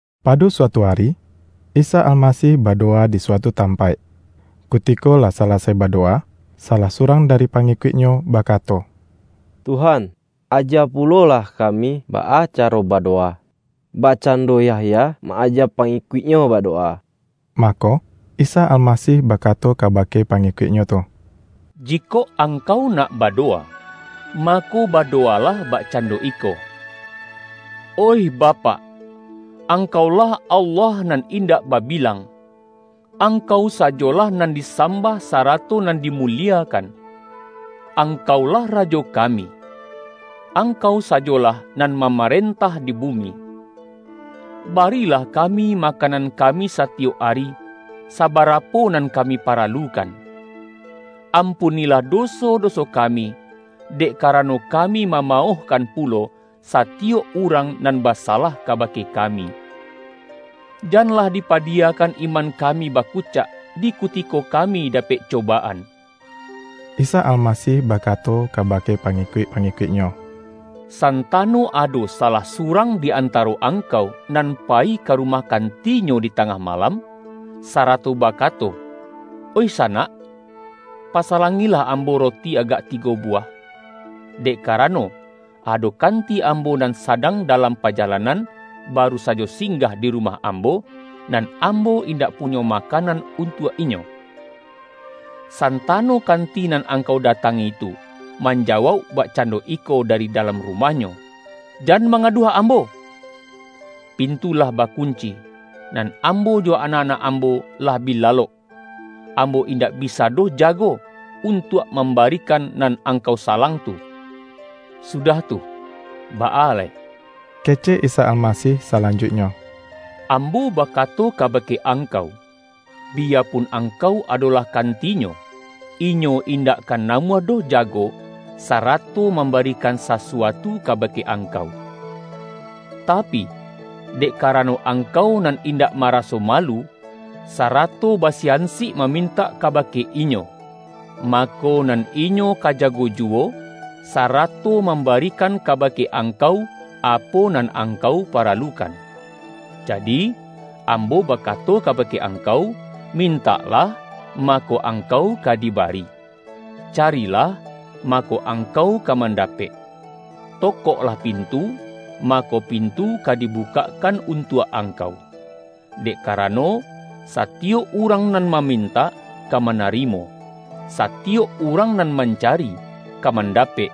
Pado suatu ari, Isa Almasih badowa di suatu tampaik. Kuti-ko lah salasai badowa, salah surang dari pangikuik-Nyo bakato,”Tuhan, aja pulolah kami baa caro badowa, bakcando Yahya ma-aja pangikuik-nyo badowa.” Mako, Isa Almasih bakato kaba-ke pangikuik-Nyo tu,”Jikok angkau nak badowa, mako, badowalah bak-cando iko, ’Oih Bapak, Angkau-lah Allah Nan Indak Babilang. Angkau sajolah nan disambah, sarato nan dimuliekan. Angkau-lah Rajo kami. Angkau sajolah nan mamarentah di bumi. Barilah kami, makanan kami satiyok ari, sabarapo nan kami paralukan. Ampunilah doso-doso kami, dek karano, kami mamaohkan pulo, satiyok urang nan basalah kabake kami. Janlah dipadiyakan iman kami bakucak, di kutiko kami dapek cobaan.’” Isa Almasih bakato kabake pangi-kuik-pangikuik-Nyo,”Santano ado sa-lah surang di antaro angkau, nan payi ka rumah kantinyo di tangah malam, sarato bakato, ’Oih sanak, pasalangilah ambo roti agak tigo buwah, dek kara-no, ado kanti ambo nan sadang dalam pajalanan, baru sajo singgah di rumah ambo, nan ambo indak punyo makan-an untuak inyo!' Santano kanti nan angkau datangi tu, manjawauk bak-cando iko dari dalam rumahnyo, ’Jan manggaduah ambo! Pintu lah bakunci, nan ambo jo anak-anak ambo lah bi la-lok. Ambo indak bisa doh jago, untuak mambarikan nan angkau salang tu.’” ”Sudah tu, baa lai?” kecek Isa Alma-sih salanjuiknyo.”Ambo bakato kabake angkau! Biyapun angkau adolah kanti-nyo, inyo indak ka namuah doh jago, sa-rato mambarikan sasuatu kabake angkau. Tapi, dek karano angkau nan indak mara-so malu, sarato basiansik mamintak ka-bake inyo, mako, nan inyo ka jago juwo, sarato mambarikan kabake angkau, apo nan angkau paralukan. Jadi, Ambo ba-kato kabake angkau: Mintaklah, mako, angkau ka di bari; carilah, mako, angkau ka mandapek; tokoklah pintu, mako, pin-tu ka dibukakkan untuak angkau. Dek karano, satiyok urang nan mamintak, ka manarimo; satiyok urang nan mancari, ka mandapek,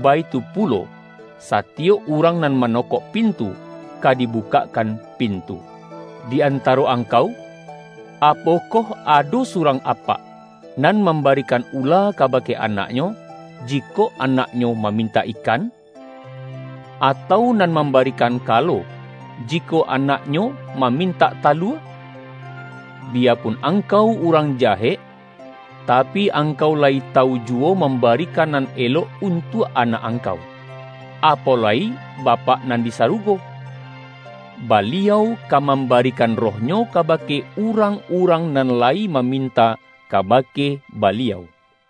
baitu pulo, satiyok urang nan manokok pintu, ka dibukakkan pintu. Di antaro angkau, apokoh ado su-rang apak, nan mambarikan ula kabake anaknyo, jikok anaknyo mamintak ikan? Atau nan mambarikan kalo, jikok anak nyo mamintak talua? Biyapun angkau urang jahek, tapi, angkau layi tawu juwo mambarikan nan elok untuak anak ang-kau. Apo lai Bapak nan di sarugo! Baliau ka mambarikan Roh-Nyo kabake urang-urang nan lai mamintak kabake Baliau!”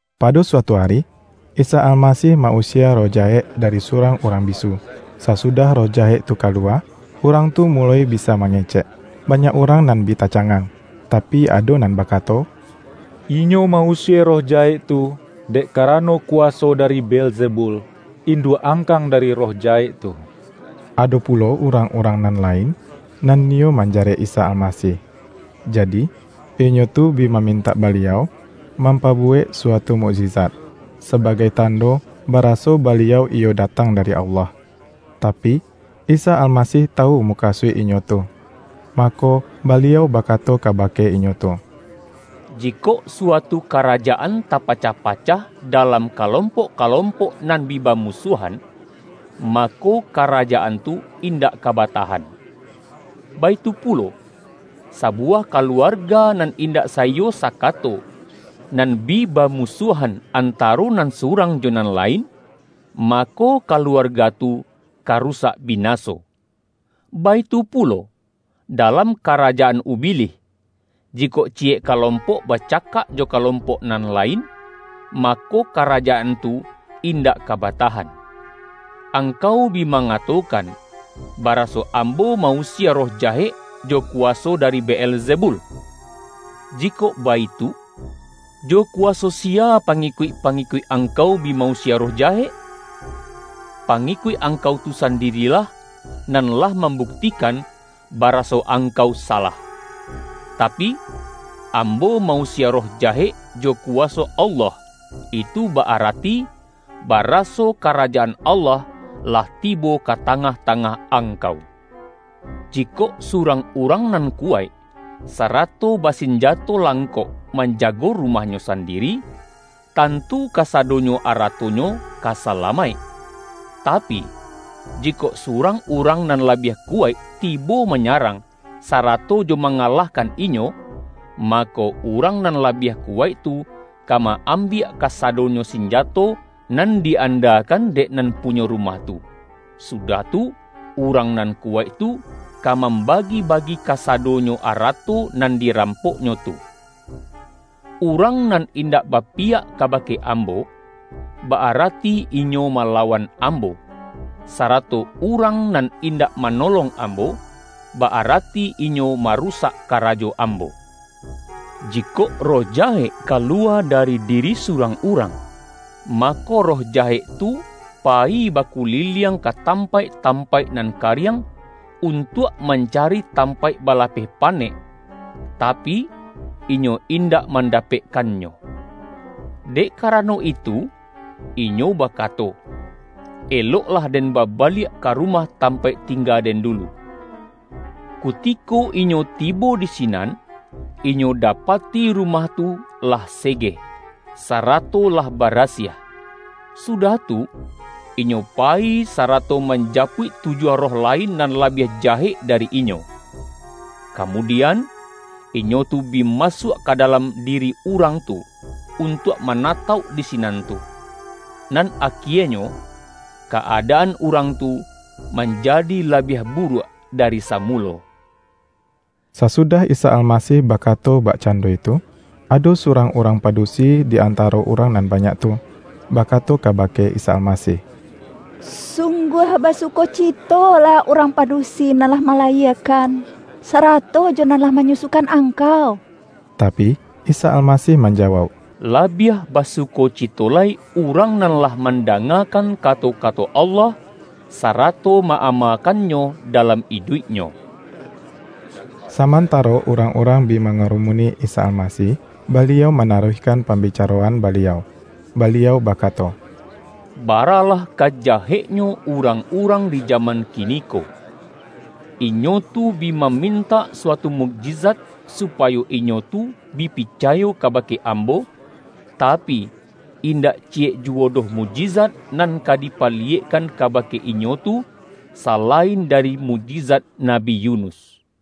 Pado suatu ari, Isa Almasih ma-usie roh jahek dari surang urang bisu. Sasudah roh jahek tu kaluwa, urang tu muloi bisa mangecek. Banyak urang nan bi tacangang, tapi, ado nan ba-kato,”Inyo ma-usie roh jahek tu, dek karano kuwaso dari Beelzebul, induak angkang dari roh jahek tu.” Ado pulo urang-urang nan lain, nan niyo manjarek Isa Almasih, jadi, inyo tu bi mamintak Baliau, mampa-buwek suatu mukjizat, sabagai tando baraso Baliau iyo datang dari Allah. Tapi, Isa Almasih tawu mukasuik inyo tu. Mako, Baliau bakato kabake inyo tu,”Jikok suatu karajaan tapa-cah-pacah, dalam kalompok-kalompok nan bi bamusuahan, mako, karajaan tu indak ka batahan. Baitu pulo, sa-buwah kaluarga nan indak saiyo sa-kato, nan bi bamusuahan antaro nan surang jo nan lain, mako, kaluarga tu ka rusak binaso. Baitu pulo, dalam karajaan Ubilih; jikok ciyek kalompok bacakak jo kalompok nan lain, mako, karajaan tu indak ka batahan. Angkau bi mangatokan, baraso Ambo ma-usie roh jahek jo kuwaso dari Beelzebul. Jikok baitu, jo kuwaso siya pangi-kuik-pangikuik angkau bi ma-usie roh jahek? Pangikuik angkau tu sandi-rilah, nan lah mambuktikan, baraso angkau salah! Tapi, Ambo ma-usie roh jahek jo kuwaso Allah, itu ba-ara-ti baraso Karajaan Allah, lah tibo ka tangah-tangah angkau. Jikok surang urang nan kuwaik, sa-rato basinjato langkok, manjago rumah-nyo sandiri, tantu kasadonyo aratonyo ka salamaik. Tapi, jikok surang urang nan labiah kuwaik tibo manyarang, sa-rato jo mangalahkan inyo, mako, urang nan labiah kuwaik tu, ka ma-ambiak kasadonyo sinjato, nan di-andakan dek nan punyo rumah tu, sudah tu, urang nan kuwaik tu, ka mambagi-bagi kasa-donyo arato nan dirampoknyo tu. Urang nan indak bapiyak kabake Ambo, ba-arati inyo malawan Ambo, sarato urang nan indak manolong Ambo, ba-arati inyo marusak karajo Ambo!” ”Jikok roh jahek kaluwa dari diri surang urang, mako, roh jahek tu payi bakuliliang ka tampaik-tampaik nan kariang, untuak mancari tampaik ba-lapeh panek, tapi, inyo indak manda-pekkannyo. Dek karano itu, inyo ba-kato, ’Eloklah den babaliak ka rumah tampaik tingga den dulu!' Kutiko inyo tibo di sinan, inyo dapati rumah tu lah segeh, sarato lah barasiah. Sudah tu, inyo payi, sarato manjapuik tujuah roh lain nan labiah jahek dari inyo. Kamudian, inyo tu bi masuak ka da-lam diri urang tu, untuak manatauk di sinan tu. Nan akienyo, ka-adaan urang tu manjadi labiah buruak da-ri samulo.” Sasudah Isa Almasih bakato bak-cando itu, ado surang urang padusi di antaro urang nan banyak tu, bakato kabake Isa Almasih,”Sungguah basu-kocitolah urang padusi nan lah mala-yiekan, sarato jo nan lah manyusu-kan Angkau!” Tapi, Isa Almasih manjawauk,”La-biah basukocito lai, urang nan lah man-dangakan kato-kato Allah, sarato ma-amakannyo dalam iduiknyo!” Samantaro urang-urang bi ma-ngarumuni Isa Almasih, Baliau mana-ruihkan pambicaroan Baliau, Baliau bakato,”Baralah ka jaheknyo urang-urang di jaman kiniko. Inyo tu bi ma-mintak suatu mukjizat supayo inyo tu bi picayo kabake Ambo, tapi, indak ci-yek juwo doh mukjizat nan ka dipa-liyekkan kabake inyo tu, salain dari mukjizat Nabi Yunus.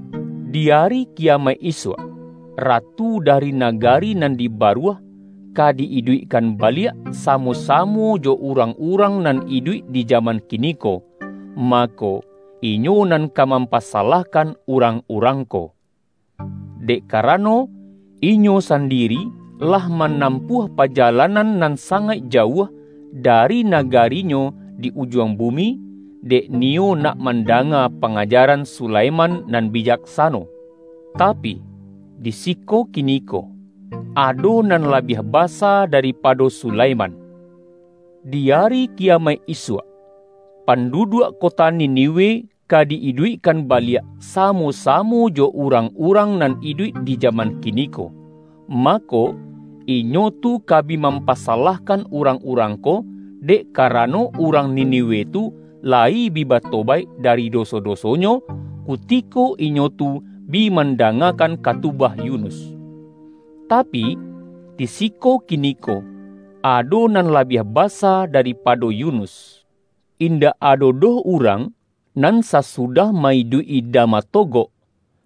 Di Ari Kiya-maik isuak, Ratu dari nagari nan di Baruah ka di-iduikkan baliak, samo-sa-mo jo urang-urang nan iduik di jaman kiniko, mako, inyo nan ka mampasa-lahkan urang-urang ko. Dek karano, inyo sandiri lah manampuah pajalan-an nan sangaik jauah, dari nagarinyo di ujuang bumi, dek niyo nak manda-nga pangajaran Sulaiman nan bijak-sano. Tapi, di siko kiniko, ado nan la-biah basa daripado Sulaiman! Di Ari Kiyamaik isuak, panduduak kota Ni-niwe ka di-iduikkan baliak, samo-sa-mo jo urang-urang nan iduik di jaman kiniko, mako, inyo tu ka bi mampa-salahkan urang-urang ko, dek karano urang Niniwe tu layi bi batobaik dari doso-dosonyo, kutiko inyo tu bi man-dangakan katubah Yunus. Tapi, di si-ko kiniko, ado nan labiah basa dari-pado Yunus!” ”Indak ado doh urang, nan sasu-dah ma-iduik-i dama togok,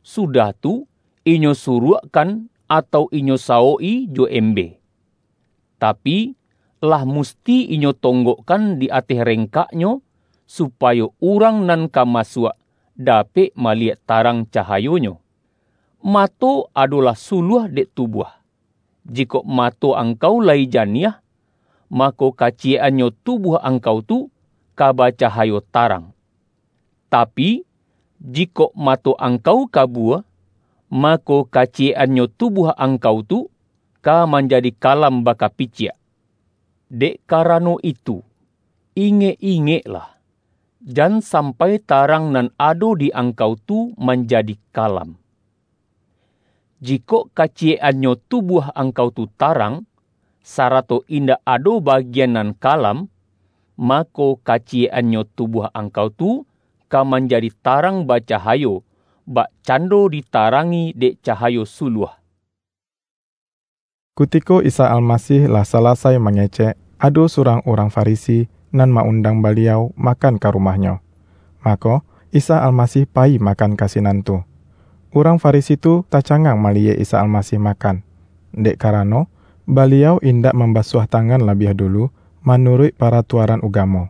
sudah tu, inyo suruakkan, atau inyo sawok-i jo embe. Tapi, lah musti inyo tonggok-kan di ateh rengkaknyo, supayo urang nan ka masuak, dapek maliyek tarang cahayonyo. Mato, adolah suluah dek tubuah. Jikok mato angkau layi janiah, mako, kaciyek-annyo tubuah angkau tu ka bacahayo tarang. Tapi, jikok mato angkau kabua, mako, kaciyek-annyo tubuah angkau tu, ka man-jadi kalam bakapiciak. Dek karano itu, ingek-ingeklah, jan sampai tarang nan ado di angkau tu manjadi kalam. Jikok kaciyek-annyo tubuah ang-kau tu tarang, sarato indak ado bagi-an nan kalam, mako, kaciyek-annyo tubuah angkau tu ka manjadi tarang bacahayo, bakcando ditarangi dek ca-hayo suluah.” Kutiko Isa Almasih lah salasai ma-ngecek, ado surang urang Farisi, nan ma-undang Baliau makan ka rumah-nyo. Mako, Isa Almasih payi makan ka sinan tu. Urang Farisi tu taca-ngang maliyek Isa Almasih makan, dek karano, Baliau indak mambasuah ta-ngan labiah dulu manuruik paratua-ran ugamo.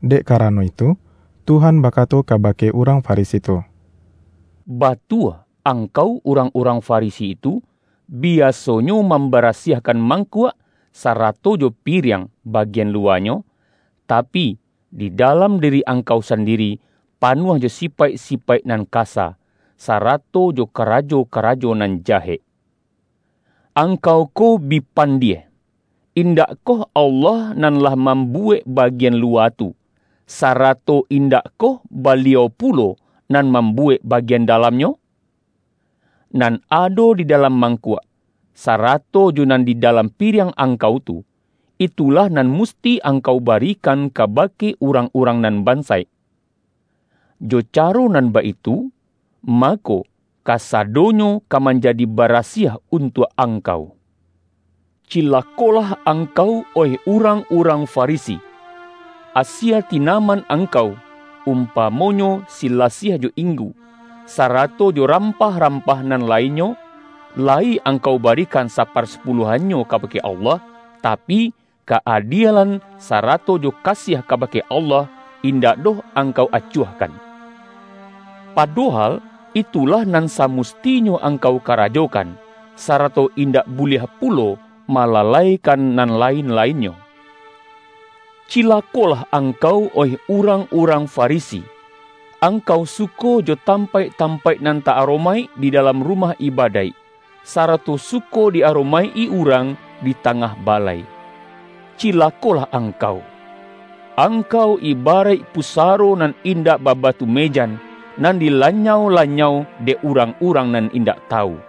Dek karano itu, Tuhan bakato kabake urang Farisi tu,”Ba-tua angkau urang-urang Farisi tu, bi-asonyo mambarasiahkan mangkuak, sarato jo piriang, bagian luwanyo, ta-pi, di dalam diri angkau sandiri pa-nuah jo sipaik-sipaik nan kasa, sarato jo karajo-karajo nan jahek. Angkau ko bi pandie! Indakkoh Allah nan lah mambuwek bagian luwa tu, sarato in-dakkoh Baliau pulo nan mambuwek bagian dalamnyo? Nan ado di da-lam mangkuak, sarato jo nan di dalam piriang angkau tu, itulah nan musti angkau barikan kabake urang-urang nan bansaik. Jo caro nan baitu, ma-ko, kasadonyo ka manjadi barasiah untuak angkau. Cilakolah angkau, oih urang-urang Farisi! Asie tinaman angkau, umpamo-nyo, silasiah jo inggu, sarato jo ram-pah-rampah nan lainnyo, layi ang-kau barikan saparsapuluahnyo kabake Allah, tapi, ka-adielan sarato jo kasiah kabake Allah, indak doh angkau acuahkan. Padohal itulah nan samustinyo angkau karajokan, sarato indak buliah pulo malalaikan nan lain-lainnyo. Cilakolah angkau, oih urang-urang Farisi! Angkau suko jo tampaik-tam-paik nan ta-aromaik di dalam rumah ibadaik, sarato suko di aromaik-i urang di tangah balai. Cilakolah angkau! Angkau ibaraik pusaro nan indak ba-batu mejan, nan dilanyau-lanyau, dek urang-urang nan indak tawu.”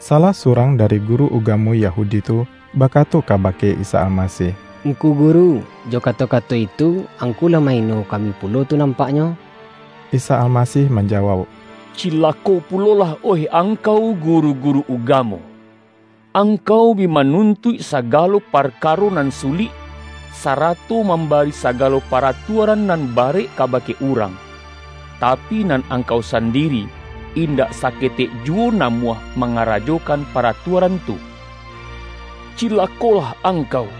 Salah surang dari guru ugamo Ya-hudi tu, bakato kabake Isa Almasih,”Ngku Guru, jo kato-kato itu, Angku lah ma-ino kami pulo tu nampaknyo!” Isa Almasih manjawauk,”Cilako pulolah oih angkau, guru-guru ugamo! Angkau bi manuntuik sagalo parkaro nan sulik, sarato mambari sagalo pa-ratuaran nan barek kabake urang, ta-pi, nan angkau sandiri, indak saketek juwo namuah mangarajokan paratua-ran tu. Cilakolah angkau!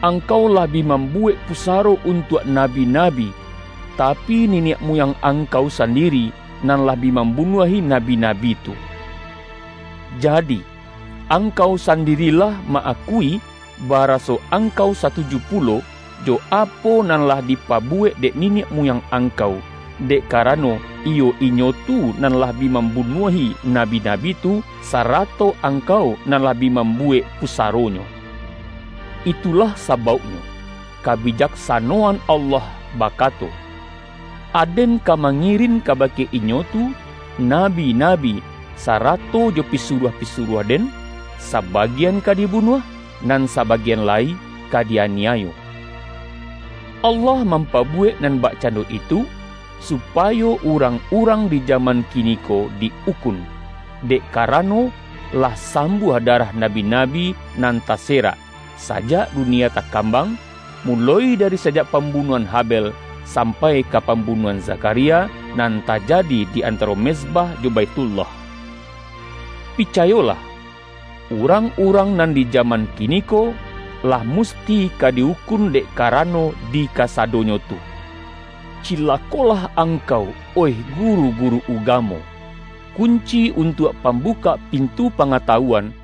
Angkau lah bi mambuwek pusaro untuak na-bi-nabi, tapi, niniak muyang angkau sandiri, nan lah bi mambunuahi na-bi-nabi tu. Jadi, angkau sandiri lah ma-akui, baraso angkau satuju pulo, jo apo nan lah dipabuwek dek niniak muyang angkau; dek karano, iyo inyo tu nan lah bi mambunuahi nabi-nabi tu, sarato angkau nan lah bi mambu-wek pusaronyo. Itulah sabauknyo, Kabijaksanoan Allah bakato, ’Aden ka mangirin kabake inyo tu, nabi-nabi, sarato jo pisuruah-pisuruah-Den; sa-bagian ka dibunuah, nan sabagian lai ka di-aniayo!' Allah mampabuwek nan bakcando itu, supayo urang-urang di jaman kiniko di-ukun, dek karano, lah sambuah darah nabi-nabi nan tase-rak, sajak dunia takambang, muloi dari sajak pambunuahan Habel sam-pai ka pambunuahan Zakharia, nan tajadi di antaro mezbah jo Baithullah. Picayolah: Urang-urang nan di jaman kiniko, lah musti ka di-ukun dek ka-rano di kasadonyo tu. Cilakolah angkau, oih guru-guru ugamo! Kunci untuak pambukak pintu pangatawuan,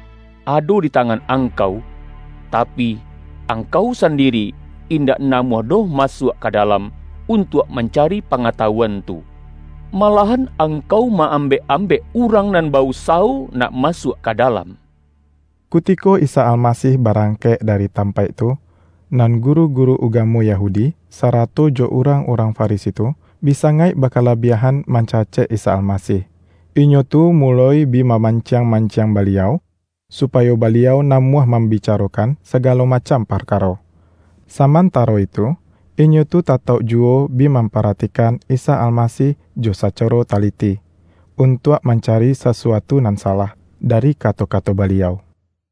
ado di tangan angkau, tapi, angkau sandiri indak namuah doh masuak ka dalam, untuak man-cari pangatawuan tu. Malahan ang-kau ma-ambek-ambek, urang nan ba-usawo nak masuak ka dalam!” Kutiko Isa Almasih barangkek da-ri tampaik tu, nan guru-guru ugamo Yahudi, sarato jo urang-urang Fari-si tu, bi sangaik bakalabiahan man-cacek Isa Almasih. Inyo tu muloi bi mamanciang-manciang Baliau, supa-yo Baliau namuah mambicarokan sa-galo macam parkaro. Samantaro itu, inyo tu tatauk juwo bi mampara-tikan Isa Almasih jo sacaro taliti, un-tuak mancari sasuatu nan salah, da-ri kato-kato Baliau.